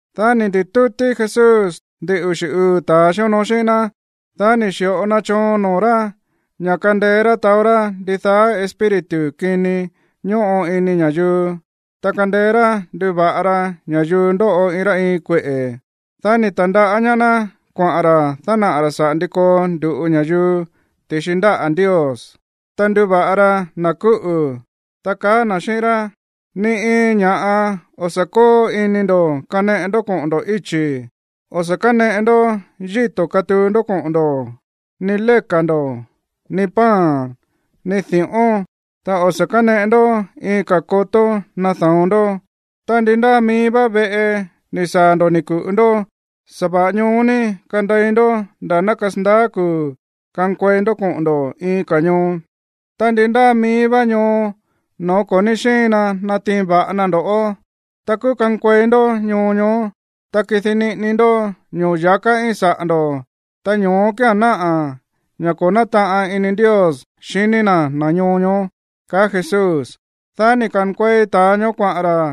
Dá ni̱ ndi̱tútí Jesús ndin uxi̱ uu̱ ta̱a xíonoo xíꞌín ná. Dá ni̱ xi̱ꞌo na choon noo̱ rá ña̱ kandeé rá taó rá ndidaá espíritu kini ñóꞌo ini ña̱yuu, ta kandeé rá nduva̱ꞌa ra ña̱yuu ndóꞌo iin rá iin kueꞌe̱. Dá ni̱ ta̱ndaꞌá ñaá ná kuaꞌa̱n ra̱ dánaꞌa̱ ra̱ saꞌa̱ ndi koo ndu̱ꞌu ña̱yuu ti̱xi ndáꞌa̱ Ndios, ta nduva̱ꞌa ra na̱ kúꞌu̱, ta kaá na̱ xíꞌín rá: ―Ni iin ña̱ꞌa o̱ sa̱ kóo ini ndo̱ kaneꞌe ndó koꞌo̱n ndo̱ íchi̱, o̱ sa̱ káneꞌe ndó yíto̱ katuu ndó koꞌo̱n ndo̱, ni léka̱ ndo̱, ni pan, ni di̱ꞌón, ta o̱ sa̱ káneꞌe ndó iin ka̱ kotó nada̱on ndó. Ta ndi ndáa mií vá veꞌe ni̱ saa̱ ndo̱ ni̱ ku̱ꞌu ndó, sa̱va̱ꞌa ñoó ní kandei ndó nda̱ ná kasandaá kuu̱ kankuei ndó koꞌo̱n ndo̱ iin ka̱ ñoo. Ta ndi ndáa mií vá ñoo no̱ó ko̱ ní xíin na natiin va̱ꞌa na ndo̱ꞌó, ta kúú kankuei ndó ñoo ñoó, ta kidi niꞌini ndó ño̱ya̱ká íin saꞌa̱ ndo̱, ta ño̱ó kía̱n náꞌa̱ ña̱ ko̱ nátaꞌan ini Ndios xiní na̱ na̱ ñoo ñoó ―kaá Jesús. Dá ni̱ ka̱nkuei ta̱a ñoó kuaꞌa̱n ra̱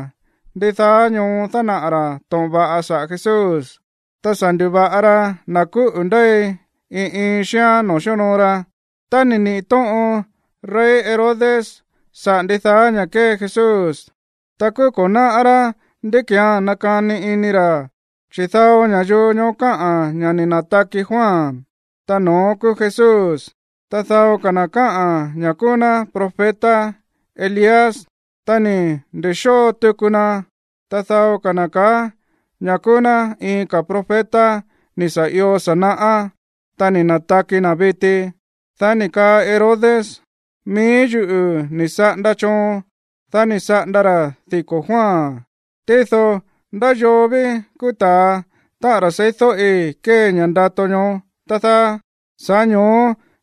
ndidaá ñoo dánaꞌa̱ ra̱ to̱ꞌon va̱ꞌa saꞌa̱ Jesús, ta sa̱ ndu̱va̱ꞌa ra na̱ kúꞌu̱ ndéi iin iin xíán noo̱ xíonoo ra. Tá ni̱ niꞌi̱ tóꞌon rey Herodes saꞌa̱ ndidaá ña̱ kée Jesús, ta kúú ko̱ náꞌá rá ndí ki̱án nakani ini ra̱. Chi̱ dao ña̱yuu ñoó kaá ña̱ ni̱ na̱taki Juan, ta no̱ón kúú Jesús. Ta dao ka̱ na̱ kaá ña̱ kúú ná profeta Elías, ta ni̱ ndi̱xóo tuku na. Ta dao ka̱ na̱ kaá ña̱ kúú ná iin ka̱ profeta ni̱ sa̱ io sa̱ naꞌá, ta ni̱ na̱taki na̱ viti. Dá ni̱ kaa Herodes: ―Mií yuꞌu̱ ni̱ saꞌanda choon, dá ni̱ saꞌanda ra̱ diko̱ Juan. Tído, ¿ndá yoo ví kúú ta̱a, táꞌa̱n ra̱ seídóꞌi kée ña̱ꞌa ndato ñoó, tá dáá? Sa̱ꞌá ño̱ó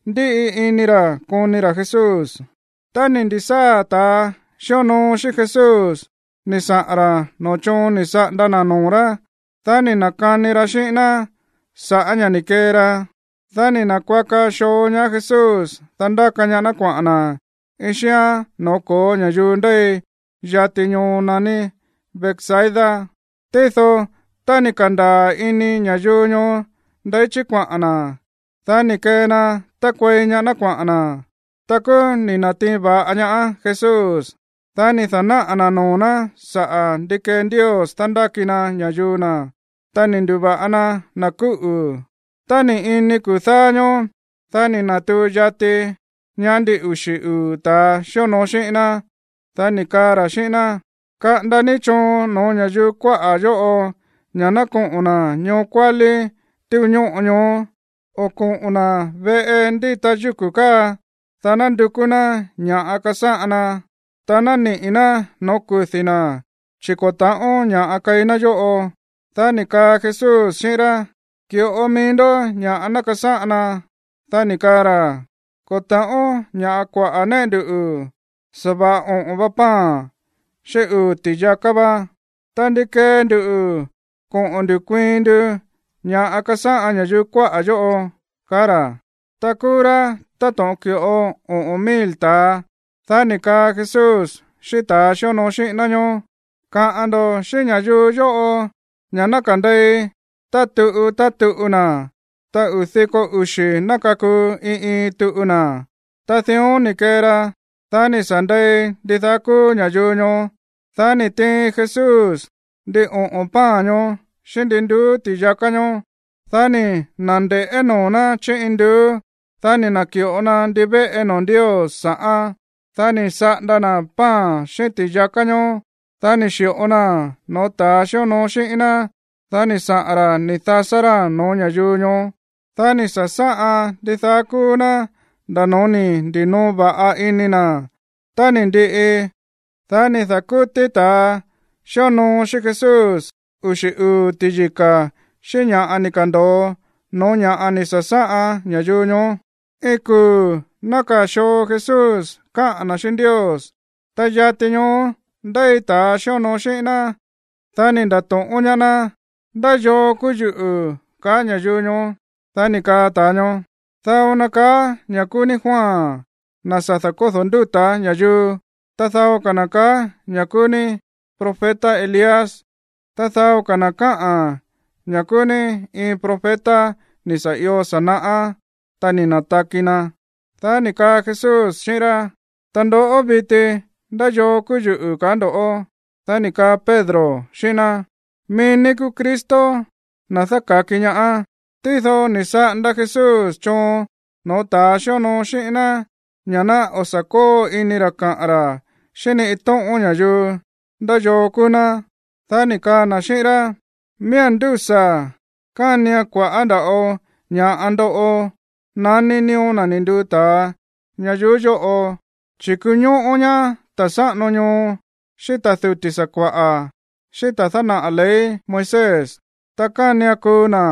ndíꞌi ini ra̱ koni ra̱ Jesús. Tá ni̱ ndi̱sáa̱ ta̱a xíonoo xíꞌín Jesús ni̱ saꞌa̱n ra̱ noo̱ choon ni̱ saꞌanda na̱ noo̱ rá, dá ni̱ na̱kani ra xíꞌín ná sa̱ꞌá ña̱ ni̱ kee ra. Dá ni̱ na̱kuaka xoo ñaá Jesús, dá ndáka ñaá ná kuaꞌa̱n na̱ iin xíán noo̱ ko̱ó ña̱yuu ndéi yati ñoo naní Betsaida. Tído tá ni̱ ka̱ndaa̱ ini ña̱yuu ñoó ndeí chí kuaꞌa̱n na̱, dá ni̱ kee na tákuei ñaá ná kuaꞌa̱n na̱. Ta kúú ni̱ na̱tiin va̱ꞌa ñaá Jesús. Dá ni̱ da̱náꞌa̱ na̱ noo̱ ná saꞌa̱ ndi kee Ndios dándáki na ña̱yuu na̱. Ta ni̱ ndu̱va̱ꞌa na na̱ kúꞌu̱. Tá ni̱ ini kuu̱ dáá ñóó, dá ni̱ na̱tuu yati ñaá ndin uxi̱ uu̱ ta̱a xíonoo xíꞌín ná. Dá ni̱ kaa ra̱ xíꞌín ná: ―Kaꞌanda ní choon no̱ó ña̱yuu kuáꞌa̱ yóꞌo ña̱ ná koꞌo̱n na̱ ñoo kuálí túu ñóꞌo káa, o koꞌo̱n na̱ veꞌe ndíta yúku̱ káa, dá ná ndukú ná ña̱ꞌa kasáꞌan na, ta ná niꞌi̱ ná no̱ó kudi̱ na̱, chi̱ ko̱ ta̱ꞌón ña̱ꞌa keí ná yóꞌo. Dá ni̱ kaa Jesús xíꞌín rá: ―Ki̱ꞌo ni mií ndó ña̱ꞌa ná kasáꞌan ná. Dá ni̱ kaa ra̱: ―Ko̱ ta̱ꞌón kua̱ꞌá ña̱ꞌa néꞌe ndu, sa̱va̱ꞌa oꞌo̱n va pan xíꞌín uu̱ ti̱yaká va. Ta, ¿ndi kee ndu koꞌo̱n ndu̱ kuiin ndu ña̱ꞌa kasáꞌan ña̱yuu kuáꞌa̱ yóꞌo? ―kaá ra̱. Ta kúú rá táto̱ꞌon ki̱ꞌo oꞌo̱n mil ta̱a. Dá ni̱ kaa Jesús xíꞌín ta̱a xíonoo xíꞌín ná ñóó: ―Kaꞌa̱n ndo̱ xíꞌín ña̱yuu yóꞌo ña̱ ná kande̱i tá tuꞌu tá tuꞌu na̱. Ta uu̱ diko uxi̱ ná kakuu iin iin tuꞌu na̱. Ta dión ni̱ kee ra. Dá ni̱ sa̱ nde̱i ndidaá kúú ña̱yuu ñoó. Dá ni̱ tiin Jesús ndin oꞌo̱n pan ñoó xíꞌín ndin nduú ti̱yaká ñoó. Dá ni̱ na̱nde̱ꞌé noo̱ ná chí induú. Dá ni̱ na̱ki̱ꞌo na ndivéꞌe noo̱ Ndios sa̱ꞌán. Dá ni̱ saꞌanda na̱ pan xíꞌín ti̱yaká ñoó. Dá ni̱ xi̱ꞌo naa̱n no̱ó ta̱a xíonoo xíꞌín ná. Dá ni̱ saꞌa̱n ra̱ ni̱ dasá ráa̱n no̱ó ña̱yuu ñoó. Dá ni̱ sa̱sáꞌan ndidaá kúú ná nda̱ no̱ó ni̱ ndi̱noo va̱ꞌa ini na̱. Tá ni̱ ndiꞌi, dá ni̱ da̱kútí ta̱a xíonoo xíꞌín Jesús uxi̱ uu̱ ti̱yika̱ xíꞌín ña̱ꞌa ni̱ ka̱ndo̱o no̱ó ña̱ ni̱ sa̱sáꞌan ña̱yuu ñoó. Iin kuu̱ nákaa̱ xoo Jesús káꞌa̱n na̱ xíꞌín Ndios, ta yati ñoó ndéi ta̱a xíonoo xíꞌín ná, dá ni̱ nda̱to̱ꞌón ñaá ná: ―¿Ndá yoo kúú yuꞌu̱, kaá ña̱yuu ñoó? Dá ni̱ kaa ta̱a ñoó: ―Dao na kaá ña̱ kúú ní Juan, na̱ sa̱ da̱kódo̱ ndúta̱ ña̱yuu. Ta dao ka̱ na̱ kaá ña̱ kúú ní profeta Elías. Ta dao ka̱ na̱ kaá ña̱ kúú ní iin profeta ni̱ sa̱ io sa̱ naꞌá, ta ni̱ na̱taki na̱. Dá ni̱ kaa Jesús xíꞌín rá: ―Ta ndoꞌó viti, ¿ndá yoo kúú yuꞌu̱, kaá ndo̱ꞌó? Dá ni̱ kaa Pedro xíꞌín ná: ―Mií ní kúú Cristo, na̱ dáka̱ki ñaá. Tído ni̱ saꞌanda Jesús choon no̱ó ta̱ xíonoo xíꞌín ná ña̱ ná o̱ sa̱ kóo ini ra̱ kaꞌa̱n ra̱ xíꞌín ni iin tóꞌón ña̱yuu ndá yoo kúú ná. Dá ni̱ kaa na̱ xíꞌín rá: ―Miía̱n ndúsa̱ kánian kua̱ꞌá nda̱ꞌo ña̱ꞌa ndoꞌo naní nío̱ na̱ ni̱ nduu ta̱a ñayuú yóꞌo. Chi̱ kuñóꞌó ñaá ta̱ sáꞌano ñoo, xíꞌín ta̱ duti̱ sakua̱ꞌa̱, xíꞌín ta̱a dánaꞌa̱ ley Moisés. Ta kánian kuu na̱.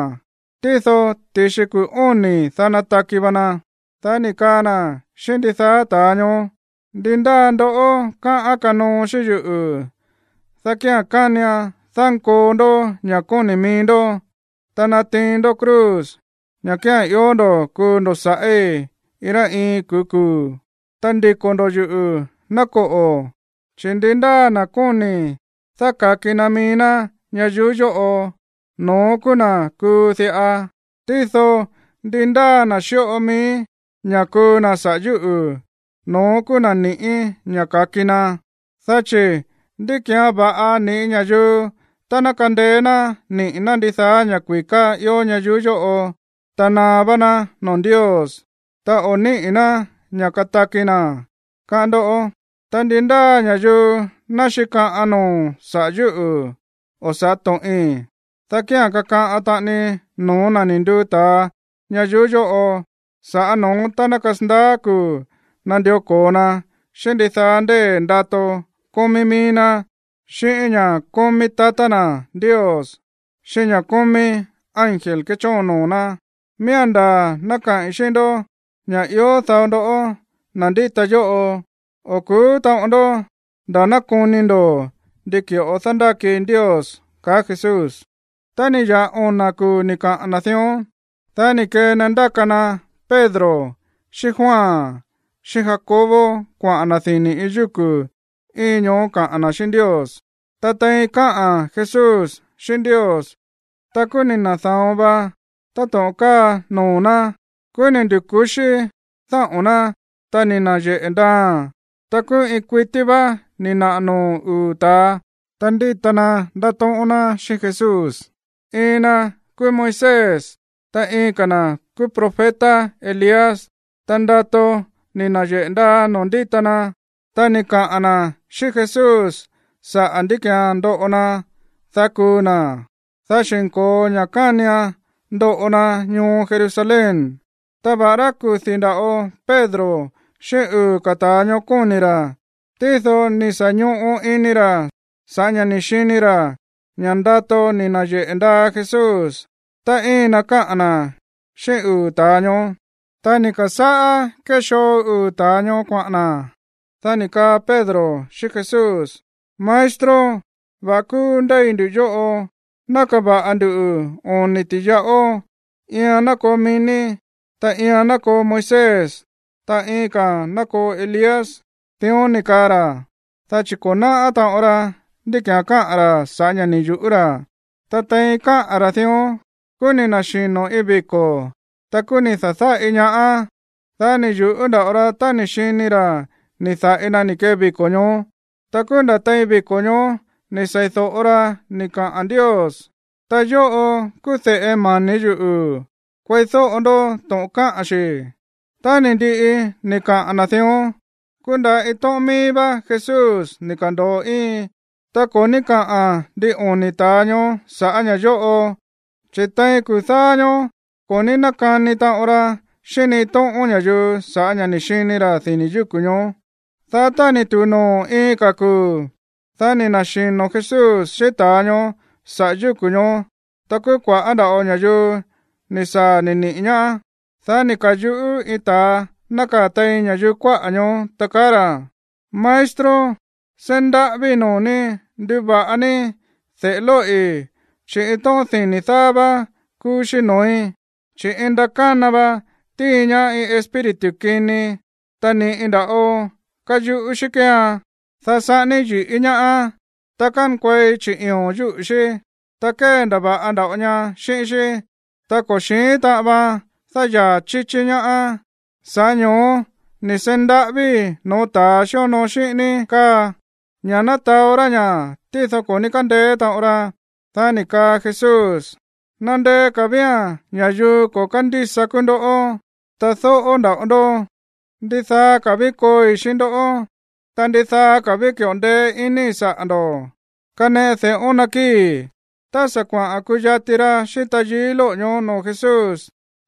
Tído ti̱xi kuu̱ óni̱, dá nataki va na. Dá ni̱ kaa na̱ xíꞌín ndidaá ta̱a ñoó: ―Ndi ndáa ndoꞌó káꞌán kanoo xíꞌín yuꞌu̱, dá kía̱n kánian dánkoo ndó ña̱ kóni̱ mií ndó, ta natiin ndó cruz, ña̱ kía̱n ió ndo̱ kuu ndo̱ sa̱ꞌí iin rá iin kuu̱ kuu̱, ta ndiko̱ ndo̱ yuꞌu̱, ná koꞌo̱. Chi̱ ndi ndáa na̱ kóni̱ dáka̱ki na mií ná ñayuú yóꞌo, no̱ón kúú na̱ kuu diꞌa. Tído ndi ndáa na̱ xíꞌo mií ña̱ kuu na̱ saꞌa̱ yúꞌu̱, no̱ón kúú na̱ ni̱ꞌí ña̱ ka̱ki na. Dá chi̱, ¿ndi ki̱án va̱ꞌa ni̱ꞌí ña̱yuu tá ná kandeé ná niꞌi̱ ná ndidaá ña̱ kui̱ká ió ñayuú yóꞌo, ta naá vá ná noo̱ Ndios, ta o̱ níꞌi̱ ná ña̱ kataki na̱, káꞌán ndó? Ta ndi ndáa ña̱yuu ná xíkaꞌan noo̱ saꞌa̱ yúꞌu̱ o sa̱ꞌá to̱ꞌin, dá kía̱n kakaꞌan taꞌani no̱ó na̱ ni̱ nduu ta̱a ñayuú yóꞌo sa̱ꞌá no̱ón tá ná kasandaá kuu̱ nandió ko̱o na xíꞌín ndidaá ndée̱ ndato kómí mií ná, xíꞌín ña̱ kómí tatá na̱ Ndios, xíꞌín ña̱ kómí ángel kéchóon noo̱ ná. Miía̱n ndaa̱ ná kaꞌi̱n xíꞌín ndó ña̱ ió dao ndoꞌó, na̱ ndíta yóꞌo, o̱ ku̱ú taꞌon ndó nda̱ ná koni ndo̱ ndi ki̱ꞌo dándáki Ndios ―kaá Jesús. Tá ni̱ ya̱ꞌa ona̱ kuu̱ ni̱ kaꞌa̱n na̱ dión, dá ni̱ kee na ndáka na Pedro xíꞌín Juan xíꞌín Jacobo kuaꞌa̱n na̱ dini̱ iin yúku̱ íin ñoó kaꞌa̱n na̱ xíꞌín Ndios. Ta tein káꞌa̱n Jesús xíꞌín Ndios, ta kúú ni̱ na̱da̱on va táto̱ꞌon káa noo̱ ná. Kúú ni̱ ndu̱ku̱xí dáꞌo̱n ná, ta ni̱ na̱yeꞌe̱ ndaaa̱n. Ta kúú iin kuití vá ni̱ naꞌa̱ noo̱ uu̱ ta̱a, ta ndíta na ndátóꞌón ná xíꞌín Jesús. Iin na kúú Moisés, ta iin ka̱ na̱ kúú profeta Elías. Ta ndato ni̱ na̱yeꞌe̱ ndaa noo̱ ndíta na. Ta ni̱ kaꞌa̱n na̱ xíꞌín Jesús saꞌa̱ ndí ki̱án ndoꞌo na, dá kuu na̱, dá xi̱nko̱o ña̱ kánian ndoꞌo na ñoo Jerusalén. Ta va̱ꞌará kudi̱ nda̱ꞌo Pedro xíꞌín uu̱ ka̱ ta̱a ñoó kóni̱ ra̱, tído ni̱ sa̱ ñoꞌo ini ra̱ sa̱ꞌá ña̱ ni̱ xini ra̱ ña̱ ndato ni̱ na̱yeꞌe̱ ndaa Jesús, ta íin na káꞌa̱n na̱ xíꞌín uu̱ ta̱a ñoó. Tá ni̱ ka̱sáꞌá kéxoo uu̱ ta̱a ñoó kuaꞌa̱n na̱, dá ni̱ kaa Pedro xíꞌín Jesús: ―Maestro, va̱ꞌa kúú ndéi nduꞌu̱ yóꞌo. Ná kava̱ꞌa ndu oni̱ ti̱yaꞌó. Iian ná koo mií ní, ta iian ná koo Moisés, ta iin ka̱a̱n ná koo Elías. Dión ni̱ kaa ra̱, dá chi̱ ko̱ náꞌá taꞌon ra ndí ki̱án káꞌa̱n ra̱ sa̱ꞌá ña̱ ni̱ yu̱ꞌú ra̱. Ta tein káꞌa̱n ra̱ dión, kúú ni̱ na̱xino̱ iin viko̱. Ta kúú ni̱ da̱dáꞌi ñaá ná. Dá ni̱ yu̱ꞌú nda̱ꞌo ra tá ni̱ xini ra̱ ni̱ da̱ꞌi na ni̱ kee viko̱ ñoó. Ta kúú nda̱ tein viko̱ ñoó ni̱ sei̱do̱ꞌo ra ni̱ kaꞌa̱n Ndios: ―Ta yóꞌo kúú de̱ꞌe mani̱ yuꞌu̱. Kueídóꞌo ndó to̱ꞌon káꞌa̱n xi̱. Tá ni̱ ndiꞌi ni̱ kaꞌa̱n na̱ dión, kúú nda̱ iin tóꞌón míí vá Jesús ni̱ ka̱ndo̱o íin. Ta ko̱ ní káꞌa̱n ndin oni̱ ta̱a ñoó sa̱ꞌá ña̱ yóꞌo, chi̱ tein kuu̱ dáá ñóó ko̱ ní nákani taꞌon ra xíꞌín ni iin tóꞌón ña̱yuu sa̱ꞌá ña̱ ni̱ xini ra̱ dini̱ yúku̱ ñoó. Dá tá ni̱ tu̱u noo̱ iin ka̱ kuu̱, dá ni̱ na̱xino̱ Jesús xíꞌín ta̱a ñoó saꞌa̱ yúku̱ ñoó. Ta kúú kua̱ꞌá nda̱ꞌo ña̱yuu ni̱ saa̱ ni̱ niꞌi̱ ñaá. Dá ni̱ ka̱yuꞌú iin ta̱a nákaa̱ tein ña̱yuu kuáꞌa̱ ñoó, ta kaá ra̱: ―Maestro, seí ndaꞌávíi̱ noo̱ ní nduva̱ꞌa ní de̱ꞌe lóꞌi̱, chi̱ iin tóꞌón dini̱ dáá vá kúú xí noo̱í, chi̱ iin ndakána va tíin ñaá iin espíritu kini, ta ni̱ꞌi nda̱ꞌo káyuꞌú xí kéean, dá saꞌání yi̱ꞌí ñaáán, ta kánkuei chiꞌi̱o̱n yúꞌu̱ xí, ta kéndava̱ꞌa nda̱ꞌo ña xíꞌín xí, ta ko̱ xi̱ín taꞌan vaan dáyaa̱ chíchí ñaá. Sa̱ꞌá ño̱ó ni̱ seí ndaꞌávíi̱ no̱ó ta̱a xíonoo xíꞌín ní káa, ña̱ ná taó rá ña̱, tído ko̱ ní kándeé taꞌon ra. Dá ni̱ kaa Jesús: ―¡Nandeé ka̱ vía̱n ña̱yuu ko̱ kándísa kúú ndoꞌó, ta dóꞌó nda̱ꞌo ndó! ¿Ndidaa ka̱ ví kooi xíꞌín ndó? Ta, ¿ndidaa ka̱ ví ki̱ꞌo ndeé iníi̱ saꞌa̱ ndo̱? Kaneꞌe de̱ꞌón ná kii. Tá sa̱ kuaꞌa̱n kuyati ra xíꞌín tayií lóꞌo̱ ñoó noo̱ Jesús,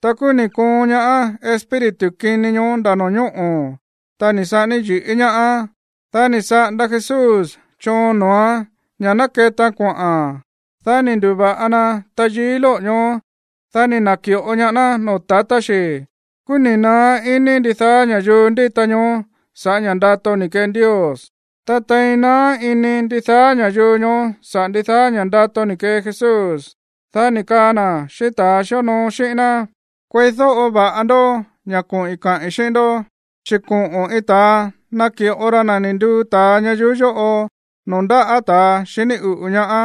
ta kúú ni̱ koon ñaá espíritu kini ñoó nda̱ no̱ñóꞌo̱, ta ni̱ saꞌání yi̱ꞌí ñaáán. Dá ni̱ saꞌanda Jesús choon noo̱án ña̱ ná ketaan kuaꞌa̱n. Dá ni̱ ndu̱va̱ꞌa na tayií lóꞌo̱ ñoó. Dá ni̱ na̱ki̱ꞌo ñaá ná noo̱ tatá xi̱. Kúú ni̱ naá iní ndidaá ña̱yuu ndíta ñoó sa̱ꞌá ña̱ ndato ni̱ kee Ndios. Ta tein naá ini ndidaá ña̱yuu ñoó saꞌa̱ ndidaá ña̱ ndato ni̱ kee Jesús, dá ni̱ kaa na̱ xíꞌín ta̱a xíonoo xíꞌín ná: ―Kueídóꞌo va̱ꞌa ndó ña̱ koꞌi̱n kaꞌi̱n xíꞌín ndó, chi̱ koꞌo̱n iin ta̱a naki̱ꞌo ra na̱ ni̱ nduu ta̱a ñayuú yóꞌo noo̱ ndáꞌa̱ ta̱ xiní uꞌu̱ ñaá.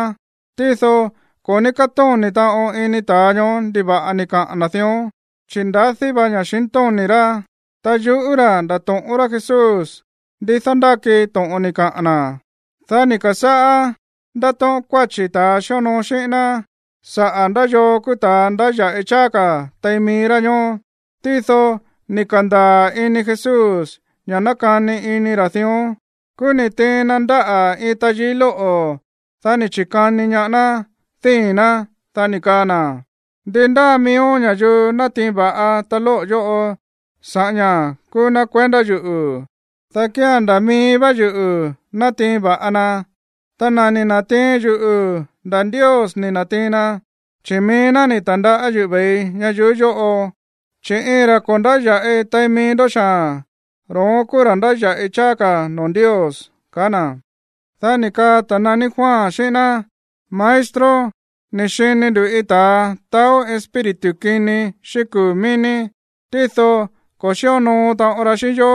Tído ko̱ ní kátóni̱ taꞌon ini ta̱a ñoó ndiva̱ꞌa ni̱ kaꞌa̱n na̱ dión, chi̱ ndadí vá ña̱xintóni̱ rá, ta yuꞌú ra̱ ndato̱ꞌón rá Jesús ndi dándáki to̱ꞌon ni̱ kaꞌa̱n na̱. Dá ni̱ ka̱sáꞌá ndátóꞌón kuáchi̱ ta̱a xíonoo xíꞌín ná saꞌa̱ ndá yoo kúú ta̱a ndáya̱ꞌi cháá ka̱ tein mií rá ñóó. Tído ni̱ ka̱ndaa̱ ini Jesús ña̱ nákani ini ra̱ dión. Kúú ni̱ tiin na ndáꞌa̱ iin tayií lóꞌo̱. Dá ni̱ chi̱kani ñaá ná díi̱n ná, dá ni̱ kaa na̱: ―Ndi ndáa miíó ña̱yuu natiin va̱ꞌa ta lóꞌo̱ yóꞌo sa̱ꞌá ña̱ kúú ná kuendá yuꞌu̱, dá kía̱n nda̱ mií vá yuꞌu̱ natiin va̱ꞌa na. Ta na̱ ni̱ na̱tiin yuꞌu̱, nda̱ Ndios ni̱ na̱tiin na, chi̱ mií ná ni̱ ta̱ndaꞌá yuꞌu̱ ve̱ii ñayuú yóꞌo. Chi̱ iin ra̱ ko̱ ndáya̱ꞌi tein mií ndó xaa̱n, ro̱ón kúú ra̱ ndáya̱ꞌi cháá ka̱ noo̱ Ndios ―kaá na̱. Dá ni̱ kaa ta̱ naní Juan xíꞌín ná: ―Maestro, ni̱ xini nduꞌu̱ iin ta̱a taó espíritu kini xíꞌín kuu̱ mií ní. Tído ko̱ xíonoo taꞌon ra xíꞌín yó,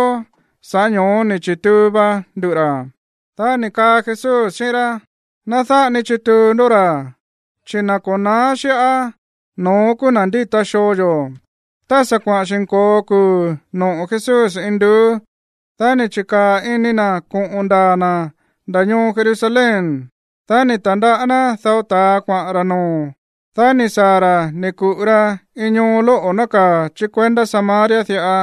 sa̱ꞌá ño̱ó ni̱ chi̱tuu va nduꞌu̱ ra̱. Dá ni̱ kaa Jesús xíꞌín rá: ―Ná dáꞌa ni chituu ndó ra̱, chi̱ na̱ ko̱ na̱á xíꞌá, no̱ón kúú na̱ ndíta xoo yo̱. Tá sa̱ kuaꞌa̱n xi̱nko̱o kuu̱ noꞌo̱ Jesús induú, dá ni̱ chi̱kaa̱ ini na̱ koꞌo̱n ndaa̱ na̱ nda̱ ñoo Jerusalén. Dá ni̱ ta̱ndaꞌá ná dao ta̱a kuaꞌa̱n ra̱ noo̱. Dá ni̱ saa̱ ra̱ ni̱ ku̱ꞌu ra iin ñoo lóꞌo̱ nákaa̱ chí kuendá Samaria diꞌa,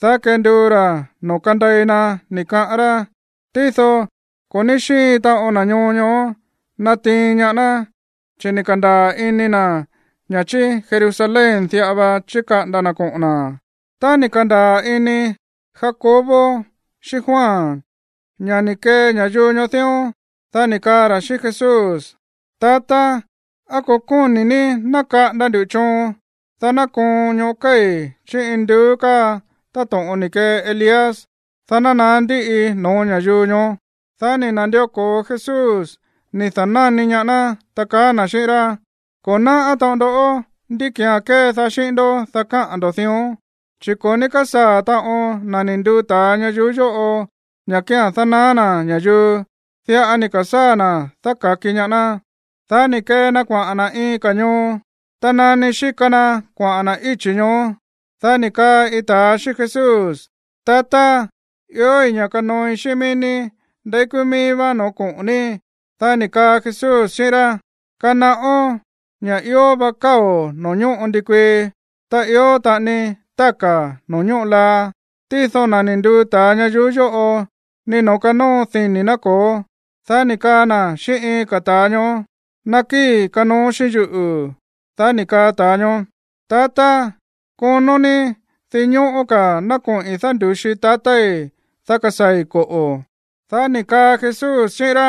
dá kenduu ra̱ noo̱ kandei na, ni̱ kaꞌán rá. Tído ko̱ ní xíin taꞌon na̱ ñoo ñoó natiin ñaá ná, chi̱ ni̱ ka̱ndaa̱ ini na̱ ña̱ chí Jerusalén diꞌa va chíkaꞌanda na̱ koꞌo̱n na̱. Tá ni̱ ka̱ndaa̱ ini Jacobo xíꞌín Juan ña̱ ni̱ kee ña̱yuu ñoó dión, dá ni̱ kaa ra̱ xíꞌín Jesús: ―Tatá, ¿á ko̱ kóni̱ ní ná kaꞌanda ndu̱ choon, dá ná koon ñoꞌó kéi̱ induú káa táto̱ꞌon ni̱ kee Elías, dá ná naá ndiꞌi no̱ó ña̱yuu ñoó? Dá ni̱ na̱ndió ko̱o Jesús ni̱ da̱náni ñaá ná, ta kaá na̱ xíꞌín rá: ―Ko̱ náꞌá taꞌon ndó ndí ki̱án kédaá xíꞌín ndó, dá káꞌa̱n ndo̱ dión, chi̱ ko̱ ní kásaa̱ taꞌon na̱ ni̱ nduu ta̱a ña̱yuu yóꞌo ña̱ kía̱n dánaá na̱ ña̱yuu, diꞌa ni̱ ka̱sáa̱ na̱ dáka̱ki ñaá ná. Dá ni̱ kee na kuaꞌa̱n na̱ iin ka̱ ñoo. Ta nani xíka na kuaꞌa̱n na̱ íchi̱ ñoó, dá ni̱ kaa iin ta̱a xíꞌín Jesús: ―Tatá, iói̱ ña̱ kanooi xíꞌín mií ní ndeí kúú míí vá no̱ó koꞌo̱n ní. Dá ni̱ kaa Jesús xíꞌín rá: ―Kanaꞌón ña̱ ió va káo̱ noo̱ ñóꞌo ndikuii, ta ió taꞌani táka̱ noo̱ ñóꞌo laa. Tído na̱ ni̱ nduu ta̱a ñayuú yóꞌo ni noo̱ kanóo dini̱ ná ko̱ó. Dá ni̱ kaa na̱ xíꞌín iin ka̱ ta̱a ñoó: ―Nakíi̱, kanoo xíꞌín yuꞌu̱. Dá ni̱ kaa ta̱a ñoó: ―Tatá, konó ní dinñóꞌó ka̱ ná koꞌi̱n dándu̱xi tatái̱, dá kasaa̱i̱, koꞌo̱. Dá ni̱ kaa Jesús xíꞌín rá: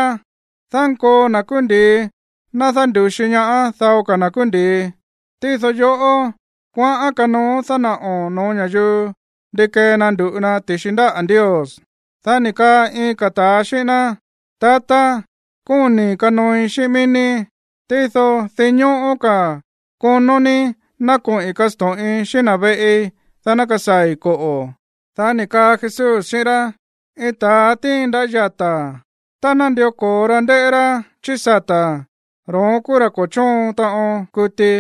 ―Dánkoo na̱ kúú ndi̱i ná dándu̱xi ñaá dao ka̱ na̱ kúú ndi̱i. Tído yoꞌó, kuaꞌán kanooón dánaꞌo̱n no̱ó ña̱yuu ndi kee na ndu̱ꞌu na ti̱xi ndáꞌa̱ Ndios. Dá ni̱ kaa iin ka̱ ta̱a xíꞌín ná: ―Tatá, kóni̱i̱ kanooi xíꞌín mií ní, tído dinñóꞌó ka̱ konó ní ná koꞌi̱n kasto̱ꞌin xíꞌín na̱ veꞌi, dá ná kasaa̱i̱, koꞌo̱. Dá ni̱ kaa Jesús xíꞌín rá: ―Iin ta̱a tíin ndaꞌá yata̱, ta nándió ko̱o ra ndéꞌé rá chí sata̱, ro̱ón kúú ra̱ ko̱ chóon taꞌon kuti.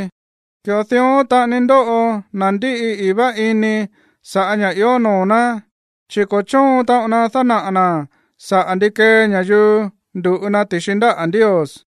Ki̱ꞌo dión taꞌani ndóꞌo na̱ ndíꞌi i̱í vá ini sa̱ꞌá ña̱ ió noo̱ ná, chi̱ ko̱ chóon taꞌon na dánaꞌa̱ na̱ saꞌa̱ ndi kee ña̱yuu ndu̱ꞌu na ti̱xi ndáꞌa̱ Ndios.